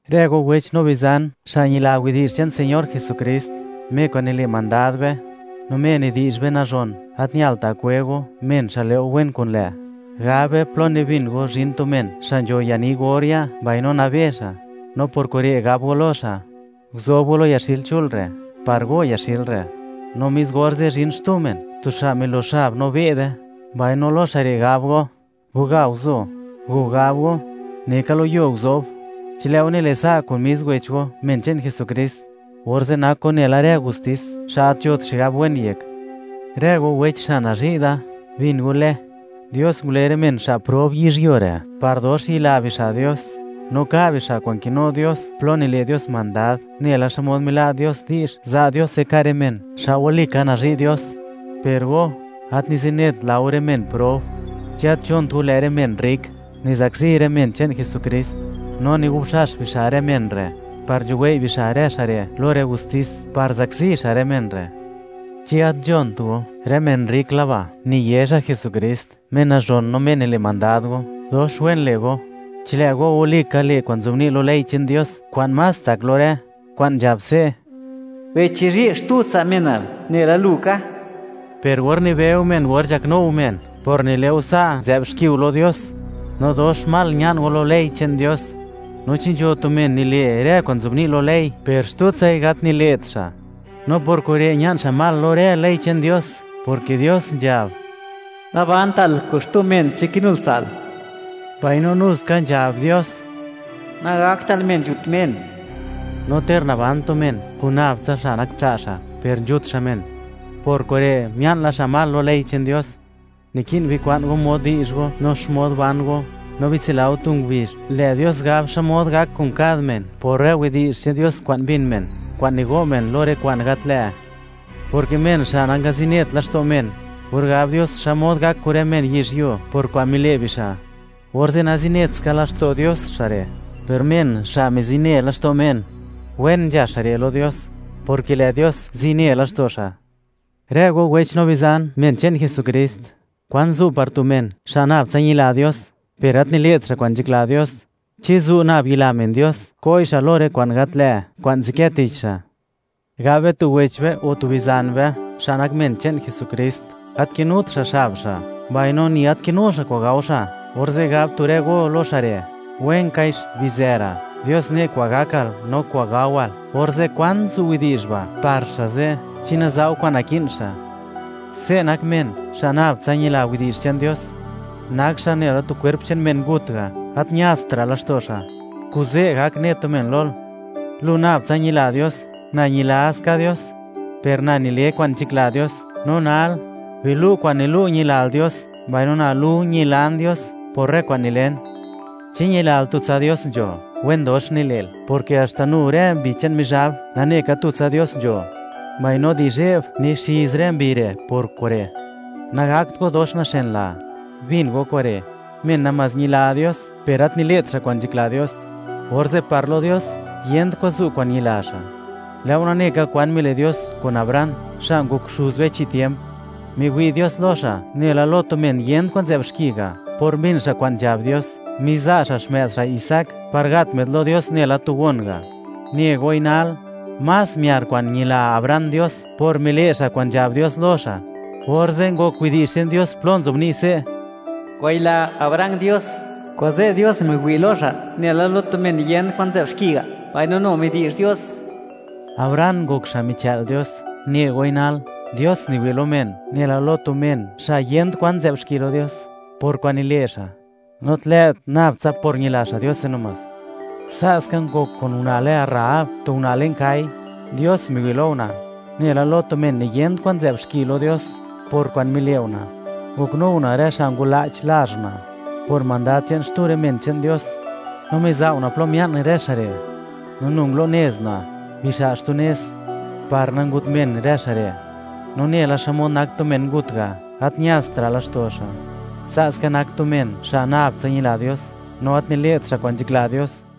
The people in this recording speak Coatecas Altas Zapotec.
Rë go wech no bizan, xa' ñila widi'zh che'n Señor Jesukrist, Me kwa'n nile' mandad be, no Me nidi'zh be nazhon; gat ñalta' kwe go men xa' le' go wen kun lë'. Gab be, plo nibin go zhin tu men xa' nzho yani gor ya', mbaino nabe xa', no por kure' gab go lo xa': “Guzob go lo yaxil chul re', par go yaxil re'.” No mis orze' zhin xtu men, tu xa' milox xab no be'de, mbaino lo xa' re' gab go: “Baga guzo”, o gab go: “Neka lo yuo guzob.” Chi lë' go nile' sa' kun mis wech go, men che'n Jesukrist, orze' nak go nela rë justis xa' gat nzhot xigab wen yek. Rë go wecha xa' nazhi' da, bin go le, Dios ngule rë men xa' prob yizhyuo re', par dox yila bixa' Dios no ka' bixa' kwa'n kinu Dios plo nile' Dios mandad, nela xmod mila' Dios di'zh, za' Diose ka' rë men, xa' wali ka nazhi' Dios. Per go, gat nizinet la go rë men prob. ¿Chi gat nzhont go, lë' rë men rrik nizakzi rë men che'n Jesukrist, no nigubxax bixa' rë men re' par nzhuwei' bixa' rë xa' re' lo rë gustis par zakzi xa' rë men re'? ¿Chi gat nzhont go, rë men rrik laba' niye xa' Jesukrist, Me nazhon, no Me nile' mandad go? Dox wen le' go, chi lë' go walika le' kwa'n nzobni' lo ley che'n Dios kwa'n más tsak lo rë, kwa'n nzhab se': “Bichizhi' xtu tsa' menal, nela lu ka.” Per gor nibeu men or nzhaknu go men, por nile' go sa' nzë'b xki go lo Dios, no dox mal ña'n go lo ley che'n Dios. No chi nzho tu men nile' rë kwa'n nzobni' lo ley, per xtutsai gat kile't xa', no por kure' ña'n xa' mal lo ley che'n Dios, porke Dios nzhab: “Nabantal kun xtu men chi kinul tsa'l”, mbaino nu ska nzhab Dios: “Nagaktal men nzhut men.” No ter naban tu men kun nab tsa xa' nak tsa' xa' per nzhut xa' men, por kure' mia'n la xa' mal lo rë ley che'n Dios. Niki'n bikwa'n go mod di'zh go no xmod ban go; no bitsila go, tu ngubizh, lë' Dios gab xmod gak kun kad men por rë widi'zh che'n Dios kwa'n mbin men, kwa'n nigo' men lo rë kwa'n gat lë', porke men xa' nangalast laxto' xtu men, or gab Dios xmod gak kun rë men yizhyuo por kwa'n mile' bixa', orze' nazinet ska laxto' Dios xa' re'; per men xa' mizine laxto' men, wen nzha xa' re' lo Dios, porke lë' Dios zine laxto' xa'. Rë go wech no bizan, men che'n Jesukrist, ¿kwan zu' par tu men, xa' nab tsa ñila Dios, per gat nile't xa' kwa'n nzhakla Dios? ¿Chi zu' nab ñila men Dios ko'i xa' lo rë kwa'n gat lë' kwa'n nzadkë tich xa'? Gab be, tu wech be o tu bizan be, xa' nak men che'n Jesukrist, gat kinut xa' xab xa', mbaino ni gat kinu xa' kwa'n gao xa', orze' gab tu rë go lo xa' re': “¡Wenkaix bizë ra', Dios ne' kwa'n gakal no kwa'n gawal!”, orze', ¿kwan zu' widi'zh ba' par xa' ze' chi naza' go kwa'n naki'n xa'? Se' nak men xa' nab tsa ñila widi'zh che'n Dios, nak xa' nela tu kwerp che'n tu men ngut ga', gat ñastra' laxto' xa'. Kuze' gak ne tu men lol: “Lu nab tsa ñila Dios; na ñila ska Dios, per na nile kwa'n nzhakla Dios. No nal, bilu' kwa'n nilu' ñilal Dios, mbaino na lu ñilan Dios por rë kwa'n nilen.” ¿Chi ñilal, tutsa Dios nzho? ¡Wen dox nile'l, porke haxta nu rë mbi che'n Mizhab nane ka tutsa Dios nzho, mbaino di zhe'b nixiz rë mbi re' por kure'! ¡Nagakt go dox naxenlaa! Bin go kure': Men namás ñila Dios, per gat nile't xa' kwa'n nzhakla Dios, orze' par lo Dios yent kwa'n zu' kwa'n ñila xa' Dios. Lë' go nane ka kwan mile' Dios kun Abraham, xa' ngok xuz be chi tiemp. Miwi' Dios lo xa' nela lo tu men yent kwan nzë'b xki ga', por mbin xa' kwa'n nzhab Dios, miza' xa' xmë'd xa' Isaac par gat më'd lo Dios nela tu gon ga'. Ne goi nal, más miar kwa'n ñila Abraham Dios por mile' xa' kwa'n nzhab Dios lo xa'. Orze' ngok widi'zh che'n Dios plo nzobni' se': “Ngwayila Abraham Dios, kuze' Dios miwi' lo xa' nela lo tu men yent kwan nzë'b xki ga'.” Mbaino nu midi'zh Dios, Abraham ngok xa' michë'l Dios. Ne goi nal, Dios niwi' lo men nela lo tu men xa' yent kwan nzë'b xki lo Dios por kwa'n nile' xa', no gat lë't nab tsa por ñila xa' Diose. Sa'ska ngok kun una' lë Rahab, tu una' le'n kai (kwa' gal). Dios miwi' lo una' nela lo tu men niyent kwan nzë'b xki lo Dios por kwa'n mile' una', ngoknu una' rë xa' ngwala'ch lazh una', por mandad che'n xtu rë men che'n Dios, no miza' una' plo mia'n rë xa' re', no nu ngulunez una' bixa' xtu nez par nangut men rë xa' re'. No nela xmod nak tu men ngut ga', gat ñastra' laxto' xa', sa' ska nak tu men, xa' nab tsa ñila Dios, no gat nile't xa' kwa'n nzhakla Dios.